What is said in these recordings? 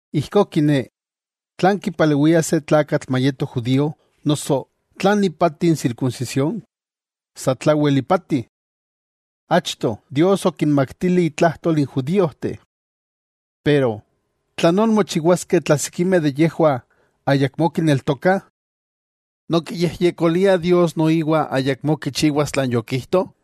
Ijkó kiné, ¿tlan kipalewia se tlakatl mayeto judío? noso ¿tlan ipati n sirkunsisión? Sa tlawel ipati. Achto, Dios okinmaktili itlajtol n judíojteh. Pero ¿tlanón mochiwaskeh tla sikimeh de yejwah ayakmó kineltokah? ¿Nonkiyejyekoliah Dios noiwa ayakmó kichiwas tlan yokijto?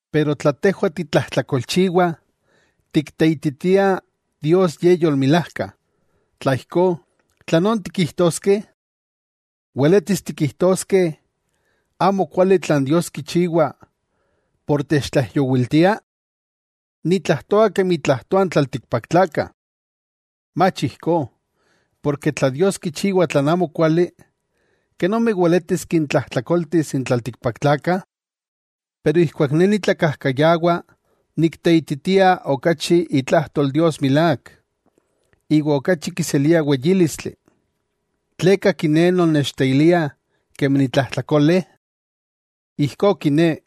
Pero tla tejwah titlajtlakolchiwah tikteititiah Dios Ye yolmilajka, tla ijkó, ¿tlanón tikijtoskeh? ¿Weletis tikijtoskeh amokuali tlan Dios kichiwa por techtlaijyowiltia? Nitlajtoa kemi tlajtoah n tlaltikpaktlakah. ¡Mach ijkó! Porke tla Dios kichiwa tlan amokuali, ¿kenomi weletis kintlajtlakoltis n tlaltikpaktlakah? Pero ijkuak ne nitlakajkayawa nikteititia okachi itlajtol Dios milák, iwa okachi kiselia weyílistli, ¿tleka kiné non nechteilia kemi nitlajtlakole? Ijkó kiné: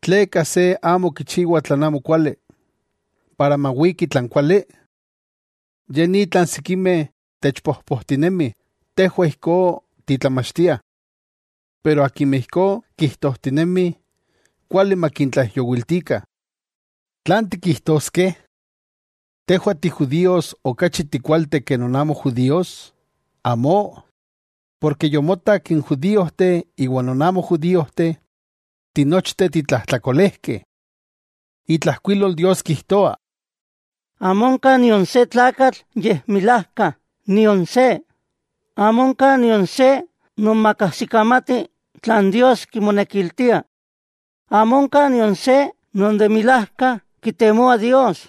¿Tleka se amo kichiwa tlan amokuali para mawiki tlan kuali? Ye ni tlan sikimeh techpojpojtinemih, tejwah ijkó titlamachtiah. Pero akimeh ijkó kijtojtinemih, kuali makintlaijyowiltikah. ¿Tlan tikijtoskeh? ¿Tejwah ti judíos okachi tikualteh ke non amo judíos? ¡Amó! Porke yomotak n judíojteh iwa non amo judíojteh, tinochteh titlajtlakolejkeh. Itlajkuilol Dios kijtoa: Amo onka nion se tlakatl yekmilajka, nion se. Amo onka nion se non makajsikamati tlan Dios kimonekiltia; amo onka nion se non de milajka kitemoa Dios.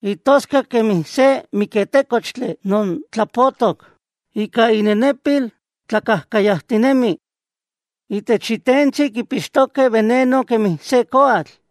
Intoskak kemi se miketékochtli non tlapotok; Ika innenepil tlakajkayajtinemih. Itech intentsi kipixtokeh beneno kemi se koatl.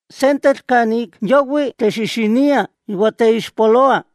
Sentetl kan ik yawih texixiniah iwa teixpoloah.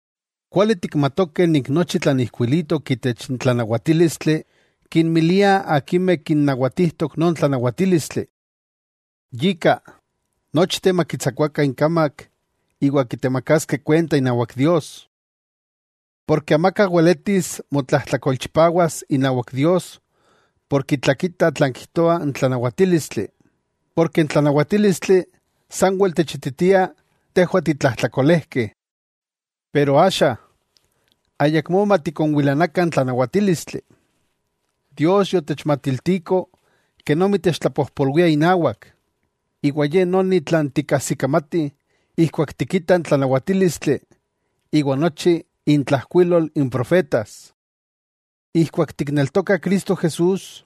Kuali tikmatokeh nik nochi tlan ijkuilitok itech n tlanawatílistli, kinmilia akimeh kinnawatijtok non tlanawatílistli. Yika, nochteh makitsakuakah inkamak iwa kitemakaskeh kuenta inawak Dios. Porke amaka weletis motlajtlakolchipawas inawak Dios por kitlakita tlan kijtoa n tlanawatílistli, porke n tlanawatílistli sanwel techititia tejwah titlajtlakolejkeh. Pero axa, ayakmó matikonwilanakah n tlanawatílistli, Dios yotechmatiltiko kenomi techtlapojpolwia inawak, iwa ye noni tlan tikajsikamatih ijkuak tikitah n tlanawatílistli iwa nochi intlajkuilol n profetas. Ijkuak tikneltokah Cristo Jesús,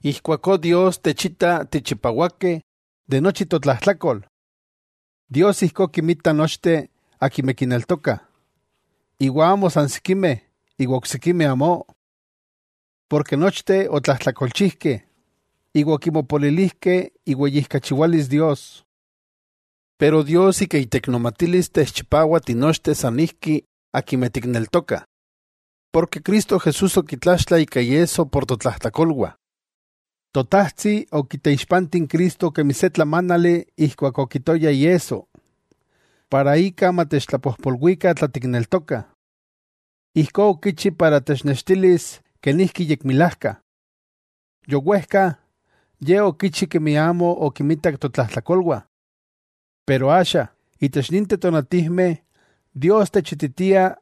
ijkuakó Dios techita tichipawakeh de nochi totlajtlakol. Dios ijkó kinmita nochteh akimeh kineltokah, iwa amo san sikimeh iwa oksikimeh amó. Porke nochteh otlajtlakolchijkeh, iwa okimopolilijkeh iweyijkachiwalis Dios. Pero Dios ika iteiknomatilis techchipawa tinochteh san ijki, akimeh tikneltokah, porke Cristo Jesús okitlaxtla ika iesso por totlajtlakolwah. Totajtsi okiteixpanti n Cristo kemi se tlamánali ijkuak okitoya iesso, para ika matechtlapojpolwikah tla tikneltokah. Ijkó okichi para technextilis kenijki yekmilajka. Yowejka, Ye okichi kemi amo okimitak totlajtlakolwah. Pero axa itech ninteh tonatijmeh Dios techititia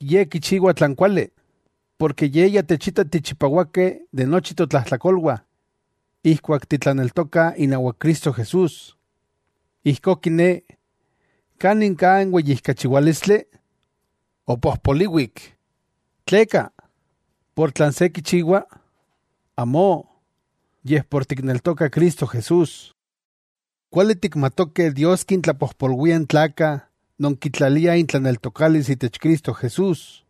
Ye kichiwa tlan kuali, porke Ye ya techita tichipawakeh de nochi totlajtlakolwah ijkuak titlaneltokah inawak Cristo Jesús. Ijkó kiné, ¿kanin ka n weyijkachiwálistli? ¡Opojpoliwik! ¡Tleka!, por tlan se kichiwa. ¡Amó!, yej por tikneltokah Cristo Jesús. Kuali tikmatokeh Dios kitlapojpolwia n tlakatl non kitlalia itlaneltokalis itech Cristo Jesús,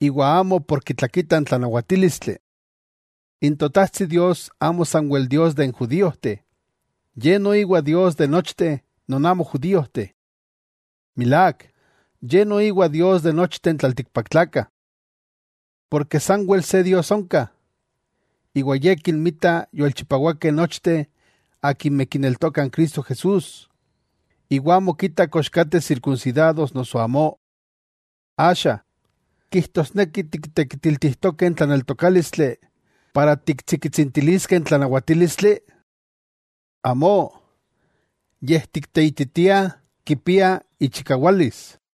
iwa amo por kitlakita n tlanawatílistli. N Totajtsi Dios amo sanwel Dios de n judíojteh. Ye noiwa Dios de nochteh non amo judíojteh. Milák, Ye noiwa Dios de nochteh n tlaltikpaktlakah. Porke sanwel se Dios onka, iwa Ye kinmita yolchipawakeh nochteh akimeh kineltokah n Cristo Jesús, iwa amo kita kox kateh sirkunsidados noso amó. Axa, ¿kijtosneki tiktekitiltijtokeh n tlaneltokálistli para tiktsikitsintiliskeh n tlanawatílistli? ¡Amó! Yej tikteititiah kipia ichikawalis.